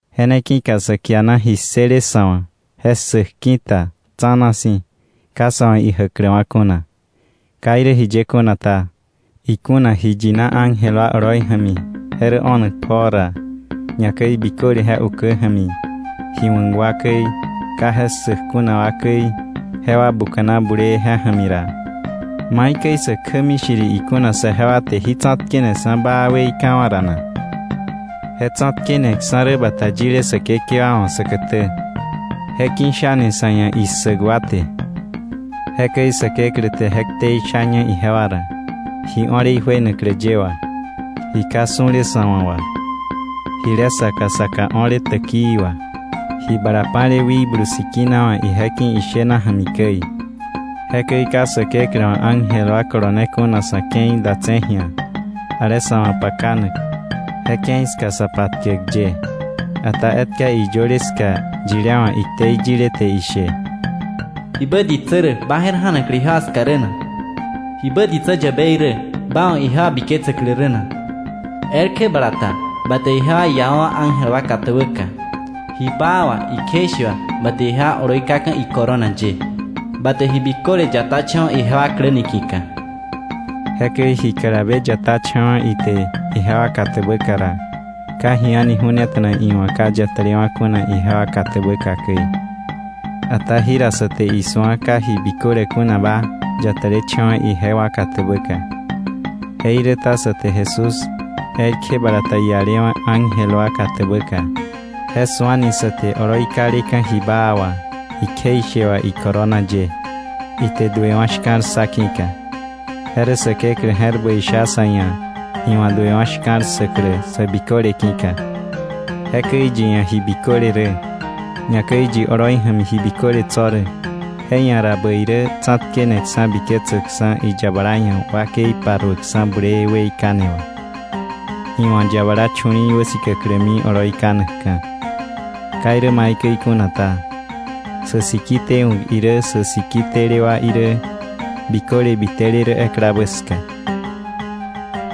Je ne ki̱ka sa kiana ji ssële sa̱ wa̱ je ssäk ki̱ta tsa̱na si̱ ka sa̱ wa̱ ijäkläwa̱ kuna. Ka irä jiye kuna ta, ikuna ji yina ángel wa oloi ja̱mi je rä o̱nak pjoo ra, ñakäi biköle je ukä ja̱mi ji wa̱k wa käi, ka je ssäk kuna wa käi, jewa buka̱na bulee je ja̱mi ra, ¿maikäi sä kjämi shiri ikuna saje wa te jí tsa̱tkeneksa̱ baa weikawa̱ ra na? Je tsa̱tkeneksa̱ rä bata yile Säkekewa wa̱ säkätä, je ki̱shani sa̱ ia̱ issäk wa te. Jekäi Säkeklä te je ktei shaña ijewa ra, ji o̱le ijuenaklä ye wà, ji ka su̱le sa̱ wa̱ wà, jile saka saka o̱le täkii wà, ji bala pa̱le Wikblu Sikina wa̱ ije ki̱ ishena ja̱mi käi. Jekäi ka Säkeklä wa̱ ángel wa kolone kuna sa̱ ke̱i datse̱ ji̱a, ale sa̱ wa̱ pakanak, je ke̱i ska sa patkäk ye. Ata etka iyöle ska yilé wa̱ iktei yile te ishe: “¿Jibä ditsä rä, ba je̱r ja̱naklä ijewa ska rä na? ¿Jibä ditsä yäbei rä, ba wa̱ ijewa biketsäklä rä na? Elkje bala ta ba te ijewa iawa̱wa̱ ángel wa katäbäka, Ji baa wà, ikjeishe wà, ba te ijewa oloi kaka̱ icorona ye. Ba te ji biköle yatacha̱wa̱ ijewa klä niki̱ka.” Jekäi ji kalabe yatacha̱wa̱ ite ijewa katäbäka ra, ka ji a̱ni ju̱neta̱na iwa̱ ka yatälewa̱ kuna ijewa katäbäka käi. Ata jira sa te isu̱a ka ji biköle kunaba yatälecha̱wa̱ ijewa katäbäka. Jeiräta sa te Jesús, elkje bala ta ialewa̱ ángel wa katäbäka, je su̱ani sa te ji baa wà, ikjeishe wà oloi kaleka̱ icorona ye, ite duewa̱ shka̱l ssa ki̱ka. Je rä Säkeklä je̱r bäi sha sa̱ ia̱ iwa̱ duewa̱ shka̱l ssäklä sä biköle ki̱ka. Jekäi yi ia̱ ji biköle rä, ñakäi yi oloi ja̱mi ji biköle tso̱ rä, je ia̱ ra bäi rä tsa̱tkeneksa̱ biketsäkksa̱ iyabala ia̱ wakei paruäkksa̱ bulee weikane wà, iwa̱ yabala chu̱li̱i̱ wäsikäklämi oloi kanakka̱. Ka irä maikäi kuna ta, sä siki tewa̱k irä sä siki tele wa irä, biköle bitele rä eklabä ska.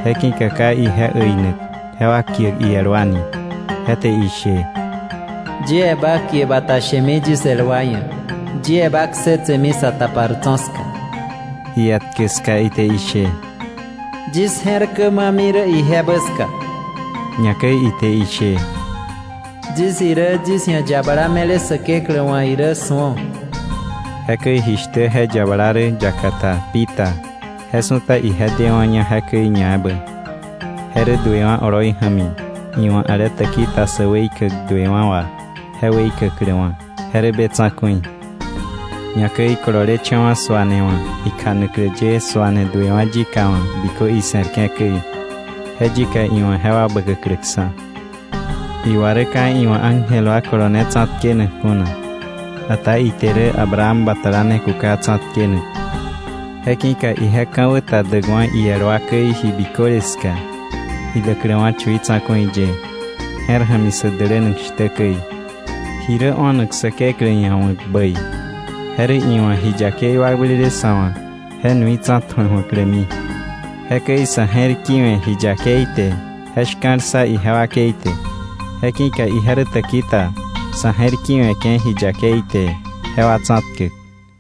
Je ki̱ka ka ije äinak jewa kiäk iel wa ni. Je te ishe: “Yie ba kie bata shemi yis el wa ia̱. Yie ba ksetsemi sa tapar tso̱ ska.” Ietkä ska ite ishe: “Yis je̱r blämiwa̱ ijebä ja̱mi.” Ñakäi ite ishe: “Yis irä yis ia̱ yabala me̱le Säkeklä wa̱ irä su̱o.” Jekäi jishtä je yabala rä yaka ta pi ta, je su̱ta ije dewa̱ña jekäi ñaebä. Je rä duewa̱ oloi ja̱mi iwa̱ ale täki ta sä weikäk duewa̱ wà je weikäkläwa̱, je rä be tsa̱ku̱i, ñakäi kololecha̱wa̱ suane wa̱ ikjanaklä ye suane duewa̱ yika wa̱ bikö ise̱rke̱ käi, je yika iwa̱ jewa bäkäkläksa̱. Iwa rä ka iwa̱ ángel wa kolone tsa̱tkenak kuna, ata ite rä Abraham batala ne kuka tsa̱tkenak. Je ki̱ka ije ka̱wä ta däkwa̱ iel wa käi ji biköle ska, idäkläwa̱ chui tsa̱ku̱i ye, je̱r ja̱mi sä dälänak shtä käi, ji rä o̱nak Säkeklä ia̱ wa̱k bäi. Je rä iwa̱ ji yakei wakblele sa̱ wa̱ je nui tsa̱tju̱a ju̱aklämi. Jekäi sa̱ je̱r ki̱we̱ ji yakei te je shka̱l ssa ije wakei te, je ki̱ka ije rä täki ta sa̱ je̱r ki̱we̱ke̱ ji yakei te jewa tsa̱tkäk.